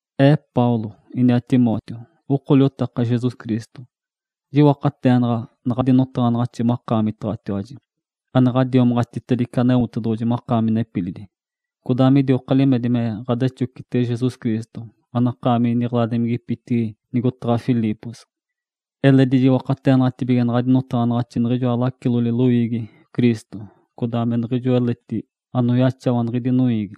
Ee Paulo, iniaa Timóteo, oko liotaka Jesus Cristo. Jiwakateenaɡ̶a naɡ̶adi notaɡ̶anaɡ̶axi makaamitaɡ̶atiwaji, ane ɡ̶adiomaɡ̶atitedice Aneotedoɡ̶oji makaami nepilidi, codaa midioka limedi me ɡ̶adexocitege Jesus Cristo, anakaami niɡ̶eladimigipitigi nigotaɡ̶a Filipos. Eledi jiwakateenaɡ̶atibige naɡ̶adi notaɡ̶anaɡ̶axi niɡ̶ijoa lacilodi loiigi Cristo, codaa me niɡ̶ijo eledi anoyaxawa niɡ̶idi noiigi.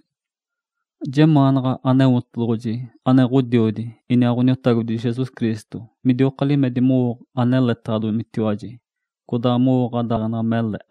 Jemaanaɡ̶a Aneotedoɡ̶oji ane Ǥodiodi iniaa Ǥoniotagodi Jesus Cristo midioka limedi mowo aneletaɡ̶adomitiwaji, codaa mowo ɡ̶adaaleɡ̶enali mele.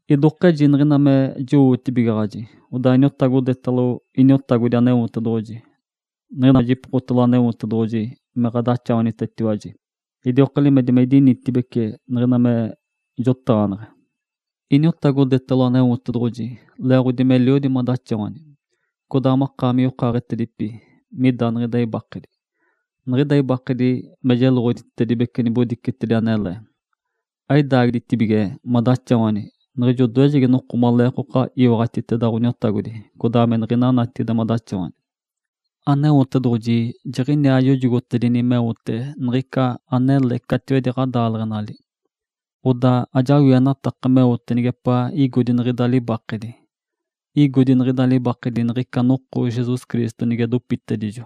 Idokeji niɡ̶ina me jowootibigaɡ̶ajitiwaji, odaa iniotagodetalo Iniotagodi Aneotedoɡ̶oji. Niɡ̶ina me jipokotalo Aneotedoɡ̶oji me ɡ̶adaxawanitetiwaji, idioka limedi me idinitibeci niɡ̶ina me jotaɡ̶aneɡ̶e. Iniotagodetalo Aneotedoɡ̶oji leeɡ̶odi meliodi madaxawani, codaa makaami yokaaɡ̶etedipi mida niɡ̶ida ibakedi. Niɡ̶ida ibakedi me jeloɡ̶oditedibece nibodicetedi anele. Aidaagiditibige madaxawani niɡ̶ijo odoejegi noko maleekoka iwaɡ̶atiteda Ǥoniotagodi codaa niɡ̶ina natigide madaxawani. Aneotedoɡ̶oji jiɡ̶iniaa yojogotedini meote niɡ̶ica anele catiwedi ɡ̶adaaleɡ̶enali. Odaa ajawienataka meote nigepaa igodi niɡ̶ida libakedi. Igodi niɡ̶ida libakedi niɡ̶ica noko Jesus Cristo nige dopitedijo.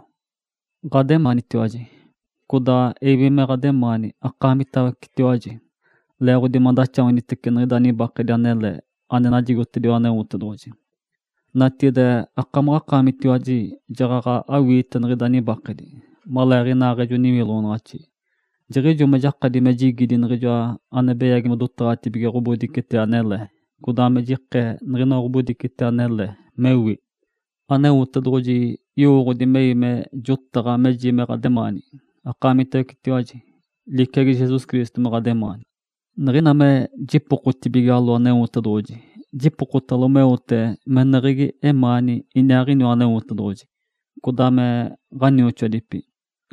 Ǥademaanitiwaji. Codaa ewi me ɡ̶ademaani akaamitawecetiwaji, leeɡ̶odi madaxawanitece niɡ̶ida nibakedi anele ane najigotediwa Aneotedoɡ̶oji. Natigide akaamitiwaji jaɡ̶aɡ̶a awiite niɡ̶ida nibakedi, maleeɡ̶inaaɡ̶ejo niwiloɡ̶onaɡ̶axi, jiɡ̶ijo me jakadi me jigidi niɡ̶ijoa ane beyagi modotaɡ̶atibige ɡ̶obodicetedi anele, codaa me jikee niɡ̶inoa ɡ̶obodicetedi anele, mewi. Aneotedoɡ̶oji yowooɡ̶odi mewi me jotaɡ̶a meji me ɡ̶ademaani akaamitawecetiwaji, liciagi Jesus Cristo me ɡ̶ademaani. Niɡ̶ina me jipokotibigalo Aneotedoɡ̶oji, jipokotalo meote meneɡ̶egi emaani iniaaɡ̶iniwa Aneotedoɡ̶oji, codaa me ɡ̶anioxoadipi.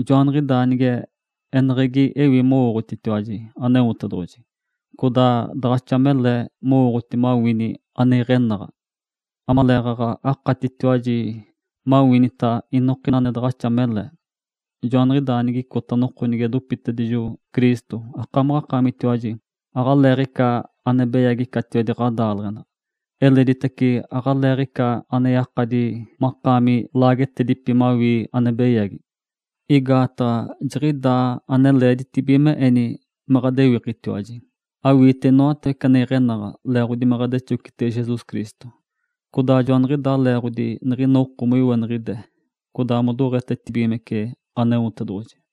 Joaniɡ̶idaa nige eneɡ̶egitace ewi mowooɡ̶oti Aneotedoɡ̶oji, odaa daɡ̶axa mele mowooɡ̶oti mawini ane iɡ̶enaɡ̶a. Amaleeɡ̶aɡ̶a akatitiwaji maniwinita inokina ane daɡ̶axa mele. Joaniɡ̶idaa nigicota noko nige dopitedijo Cristo, akamaɡ̶akaamitiwaji aɡ̶aleeɡ̶ica ane beyagi catiwedi ɡ̶adaaleɡ̶enali. Eleditace aɡ̶aleeɡ̶ica ane yakadi makaami laagetedipi mawii ane beyagi. Igaataɡ̶a jiɡ̶idaa ane leeditibige me eni me ɡ̶adewikitiwaji, mawiite inoatawece ane iɡ̶enaɡ̶a leeɡ̶odi me ɡ̶adexocitege Jesus Cristo. Codaa joaniɡ̶idaa leeɡ̶odi niɡ̶ina oko moiweniɡ̶ide, codaa modoɡ̶etetibigimece Aneotedoɡ̶oji.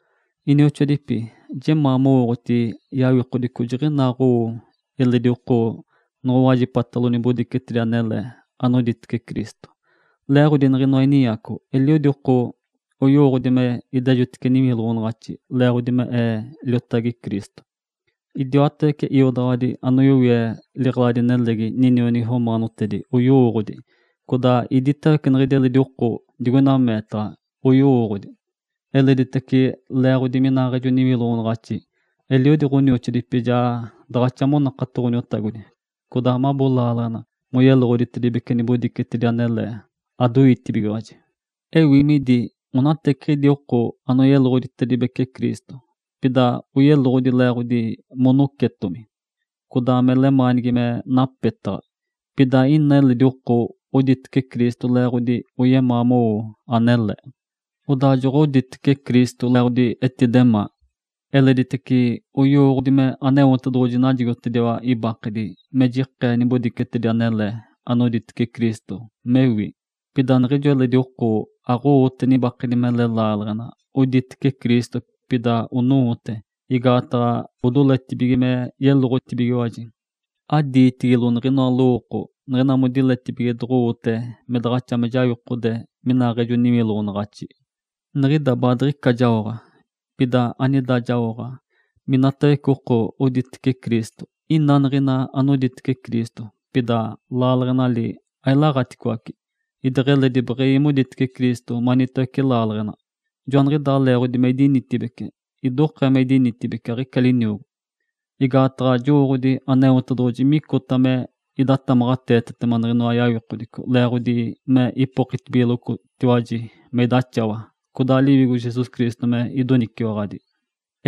Inioxoadipi, jemaa mowooɡ̶oti yawikodico jiɡ̶inaa owo eliodi oko noɡ̶owajipatalo nibodicetedi anele, anoditece Cristo. Leeɡ̶odi niɡ̶inoa ininyaco, eliodi oko oyowooɡ̶odi me idejotice niwiloɡ̶onaɡ̶axi leeɡ̶odi me ee liotagi Cristo. Idiwatawece iodaɡ̶awadi anoyowie liɡ̶eladi-nelegi ninionigi romaanotedi oyowooɡ̶odi, codaa iditawece niɡ̶idi eledi oko digoina meetaɡ̶a oyowooɡ̶odi. Eleditace leeɡ̶odi minaaɡ̶ejo niwiloɡ̶onaɡ̶axi, eliodi ɡ̶onioxoadipi ja daɡ̶axa monakato Ǥoniotagodi, codaa mabo laaleɡ̶ena moyeloɡ̶oditedibece nibodicetedi anele, adoitibigiwaji. Ewi midi onateceɡ̶idi oko anoyeloɡ̶oditece Cristo, pida oyeloɡ̶odi leeɡ̶odi monocetomi, codaa me lemaanigi me napetaɡ̶a. Pida ina eledi oko oditece Cristo leeɡ̶odi oyemaa mowo anele. Odaa joɡ̶oditece Cristo leeɡ̶odi etidemaa. Eleditace oyowooɡ̶odi me Aneotedoɡ̶oji najigotediwa ibakedi me jikee nibodicetedi anele anoditece Cristo, mewi. Pida niɡ̶ijo eledi oko aɡ̶owote nibakedi mele laaleɡ̶enali, oditece Cristo, pida owote igaataɡ̶a odoletibige me yeloɡ̶otibigiwaji. Adiitigilo niɡ̶inoa lowooko niɡ̶ina modiletibige doɡ̶owote me daɡ̶axa me jawikode minaaɡ̶ejo niwiloɡ̶onaɡ̶axi. Niɡ̶ida baadiɡ̶ica jaoɡ̶a. Pida anida jaoɡ̶a, minatawece oko oditece Cristo, ina niɡ̶ina anoditece Cristo, pida laaleɡ̶enali ailaɡ̶aticoace, idiaaɡ̶eledi beɡ̶ewi moditece Cristo, manitawece laaleɡ̶ena. Joaniɡ̶idaa leeɡ̶odi me idinitibeci. Idokee me idinitibeci, aɡ̶ica liniogo. Igaataɡ̶a jowooɡ̶odi Aneotedoɡ̶oji micota me idatamaɡ̶ateetetema niɡ̶inoa yawikodico leeɡ̶odi me ipokitibigalotiwaji me idaxawa, codaa Liwigo Jesus Cristo me idoniciwaɡ̶adi.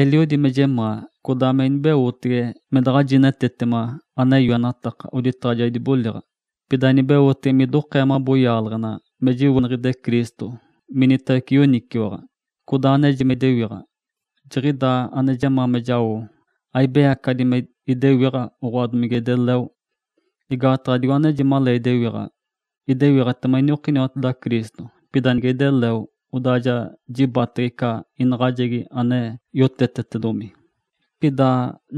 Eliodi me jemaa, codaa me inibeotege me daɡ̶a jinetetema ane yoenataka oditaɡ̶a ja idiboliɡ̶a, pida inibeotege midokee mabo yaaleɡ̶ena me jiweniɡ̶ide Cristo minitawece yoniciwaɡ̶a, codaa aneji me idewiɡ̶a. Jiɡ̶idaa ane jemaa me jao, aibeyacaɡ̶adi me idewiɡ̶a, oɡ̶oa, domige ideleo. Igaataɡ̶a digo aneji malee idewiɡ̶a, idewiɡ̶atema iniokiniwateda Cristo, pida nige ideleo, odaa ja jibatege ica inaɡ̶ajegi ane yotetetedomi. Pida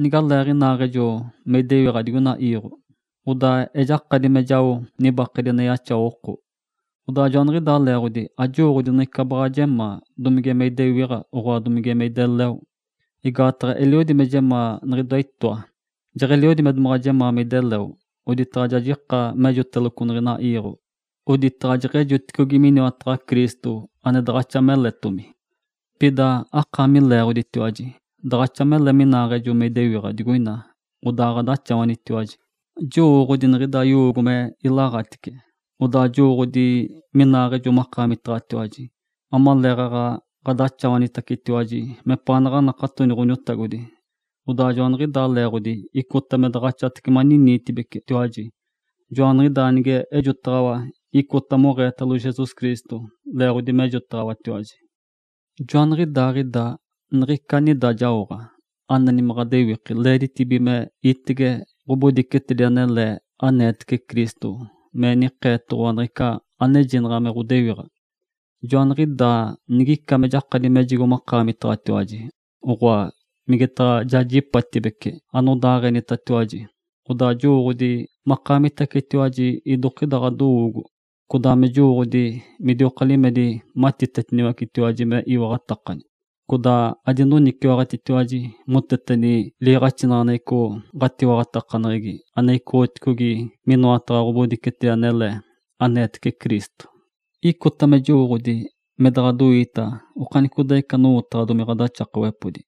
nigalee inaaɡ̶ejo me idewiɡ̶a digoina iiɡ̶o, odaa ejakadita me jao nibakedi ane yaxawa oko. Odaa joaniɡ̶idaa leeɡ̶odi ajowooɡ̶odi niɡ̶ica baɡ̶a jemaa, domige me idewiɡ̶a, oɡ̶oa, domige me ideleo. Igaataɡ̶a eliodi me jemaa niɡ̶idoa itoa. Jeɡ̶eliodi me domaɡ̶a jemaa me ideleo, oditaɡ̶a ja jika mejigoteloco niɡ̶ina iiɡ̶o, oditaɡ̶a jeɡ̶ejoticogi miniwataɡ̶a Cristo, ane daɡ̶axa meletomi. Pida akaami leeɡ̶oditiwaji, daɡ̶axa mele minaaɡ̶ejo me idewiɡ̶a digoina, odaa ɡ̶adaxawanitiwaji. Jowooɡ̶odi niɡ̶ida yowoogo me ilaɡ̶atice. Odaa jowooɡ̶odi minaaɡ̶ejo makaamitaɡ̶atiwaji, amaleeɡ̶aɡ̶a ɡ̶adaxawanitiwaji mepaanaɡ̶a anakatoni Ǥoniotagodi. Odaa joaniɡ̶idaa leeɡ̶odi icota me daɡ̶axatace maniniitibecitiwaji. Joaniɡ̶idaa nige ejotacaɡ̶awatiwaji, icota moɡ̶eetetalo Jesus Cristo, leeɡ̶odi mejotaɡ̶awatiwaji. Joaniɡ̶idaaɡ̶ida niɡ̶ica anida jaoɡ̶a, aneni me ɡ̶adewiki leeditibige me itege ɡ̶obodicetedi anele aneetece Cristo me nikeetoɡ̶owa niɡ̶ica anejinaɡ̶a me ɡ̶odewiɡ̶a. Joaniɡ̶idaa nigica me jakadi mejigo ɡ̶adiwinitiwaji, oɡ̶oa, migetaɡ̶a jajipatibece anodaaɡ̶enitatiwaji, odaa ja jowooɡ̶odi makaamitawecetiwaji idokida ɡ̶adowoogo, codaa me jowooɡ̶odi midioka limedi matitetitiwaji me iwaɡ̶atakani, codaa adinoniciwaɡ̶atitiwaji moteteni liiɡ̶axinaɡ̶aneɡ̶eco ɡ̶atiwaɡ̶atakaneɡ̶egi ane icoɡ̶otigi minoataɡ̶a ɡ̶obodicetedi anele, aneetece Cristo. Icota me jowooɡ̶oditiwaji me daɡ̶adoiita okanicodaaɡ̶icata anowotaɡ̶adomi ɡ̶adaxakawepodi,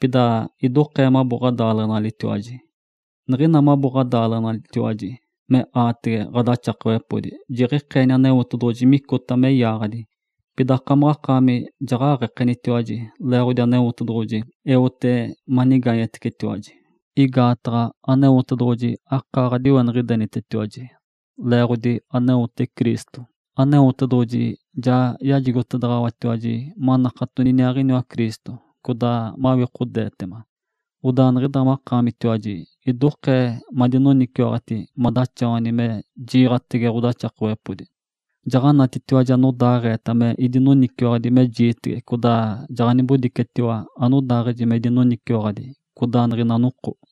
pida idokee mabo ɡ̶adaaleɡ̶enalitiwaji. Niɡ̶ina mabo ɡ̶adaaleɡ̶enalitiwaji me aatege ɡ̶adaxakawepodi jiɡ̶ikeenitiogi Aneotedoɡ̶oji micota me yaaɡ̶adi, pida akamaɡ̶akaami jaɡ̶aɡ̶ekenitibigiwaji, leeɡ̶odi Aneotedoɡ̶oji eote manigaanyetiwaji. Igaataɡ̶a Aneotedoɡ̶oji akaa ɡ̶adiweniɡ̶idenitetiwaji. Leeɡ̶odi aneote Cristo, Aneotedoɡ̶oji ja yajigotedaɡ̶awatiwaji manakatoni iniaaɡ̶iniwa Cristo, codaa mawikodeetema. Odaa niɡ̶ida makaamitiwaji idokee madinoniciwaɡ̶ati madaxawani me jiiɡ̶atege ɡ̶odaxakawepodi. Jaɡ̶anatitiwaji anodaaɡ̶eeta me idinoniciwaɡ̶adi me jiitege codaa jaɡ̶anibodicetiwa anodaaɡ̶eji me idinoniciwaɡ̶adi codaa niɡ̶ina noko.